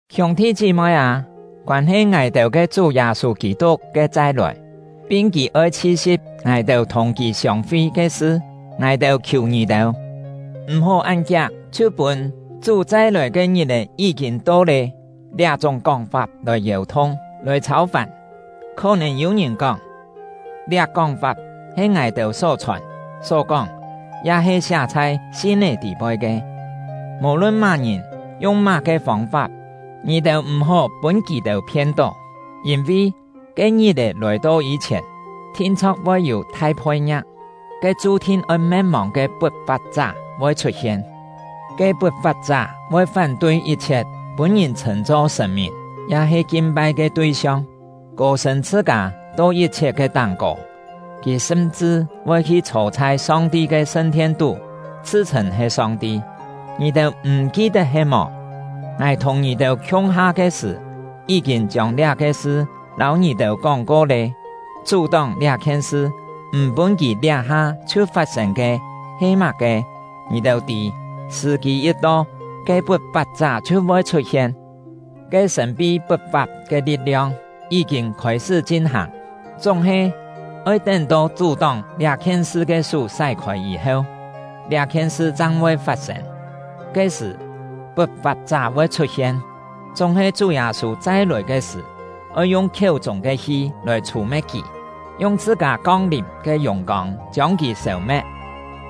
Hiûng-thi chí-moi â, koân-he ngài-têu ke Chú Yâ-sû Kî-tuk ke chai-lòi, pin kì oi chhi-si̍p ngài-têu thùng kì siông-fi ke sṳ, ngài-têu khiù ngì-têu, m̀-hó án kiak chhiu pûn “Chú chai-lòi ke ngit-è yí-kîn to lé” liá-chúng kóng-fap lòi yèu-thung, lòi chhâu-fàn. Khó-nèn yû ngìn kóng, liá kóng-fap he ngài-têu só chhòn, só kóng, ya-he siá chhai sin-é tî-poi ke. Mò-lun má-ngìn yung má-ke fông-fap, ngì-têu m̀-hó pûn kì-têu phien-tó. Yîn-vi, ke ngit-è lòi-to yî-chhièn, thin-chho̍k voi yû thai phoi-ngia̍k; ke chu-thin oi me̍t-mòng ke Put-fap-chá voi chhut-hien. Ke Put-fap-chá voi fán-tui yit-chhiet pûn-ngìn chhṳ̂n-cho sṳ̀n-mìn ya-he kin-pai ke tui-siong, kô-sṳ̂n chhṳ-kâ to yit-chhiet ke táng-kô; kì sṳm-chṳ voi hi chhô chhai Song-ti ke sṳn-thien-tú, chhṳ-chhṳ̂n he Song-ti. Ngì-têu m̀ ki-tet he-mò? Ngài thùng ngì-têu khiung-ha ke sṳ̀, yí-kîn chiông liá-ke sṳ lâu ngì-têu kóng-ko lé. Chú-tóng liá-khien sṳ, m̀ pûn kì liá-ha chhiu fat-sên ke he má-ke, ngì-têu tî. Sṳ̀-kî yit to, ke Put-fap-chá chhiu voi chhut-hien. Ke sṳ̀n-pi put-fap ke li̍t-liong yí-kîn khôi-sṳ́ chin-hàng; chúng-he, oi tén-to chú-tóng liá-khien sṳ ke sú sái-khôi yî-heu, liá-khien sṳ chang voi fat-sên. Ke-sṳ̀, Put-fap-chá voi chhut-hien; chúng-he Chú Yâ-sû chai-lòi ke sṳ̀ oi yung khiéu-chûng ke hi lòi chhù-me̍t kì, yung chhṳ-kâ kong-lìm ke yùng-kông chiông kì sêu-me̍t.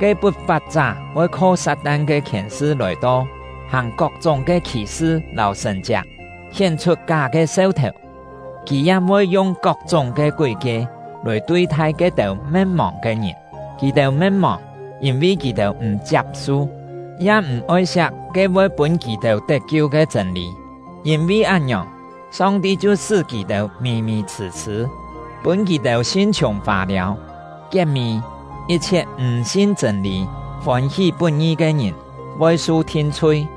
Ke Put-fap-chá voi kho Sat-tan ke khièn-sṳ lòi-to, hàng kok-chúng ke khì-sṳ lâu sṳ̀n-chiak, hién-chhut ká ke seu-thèu, kì ya voi yung kok-chúng ke kúi-kie lòi tui-thai ke-têu me̍t-mòng ke ngìn; kì-têu me̍t-mòng, yîn-vi kì-têu m̀ chiap-su, ya m̀ oi-siak ke voi pûn kì-têu tet-kiu ke chṳ̂n-lî. Yîn-vi án-ngiòng, Song-ti chhiu sṳ́ kì-têu mì-mì chhṳ̂-chhṳ̂, pûn kì-têu sin-chhiùng fâ-liâu. Kiet-mî, yit-chhiet m̀ sin chṳ̂n-lî, fôn-hí put-ngi ke ngìn, voi su thin-chhui.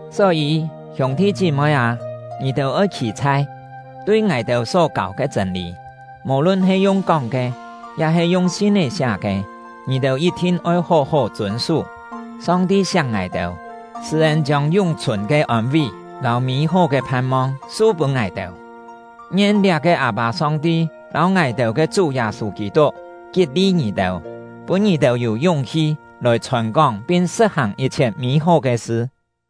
Só-yî, hiûng-thi chí-moi â, ngì-têu oi khî-chhai! Tui ngài-têu só kâu ke chṳ̂n-lî, mò-lun he yung kóng ke ya-he yung sin-é siá ke, ngì-têu yit-thin oi hó-hó chûn-sú. Song-ti siak ngài-têu, sṳ̂-ên chiông yún-chhùn ke ôn-ví lâu mî-hó ke phan-mong su-pûn ngài-têu. Ngien liá-ke Â-pâ Song-ti lâu ngài-têu ke Chú Yâ-sû Kî-tuk, kit-li ngì-têu, pûn ngì-têu yû yúng-hi lòi chhòn-kóng pin sṳ̍t-hàng yit-chhiet mî-hó ke sṳ.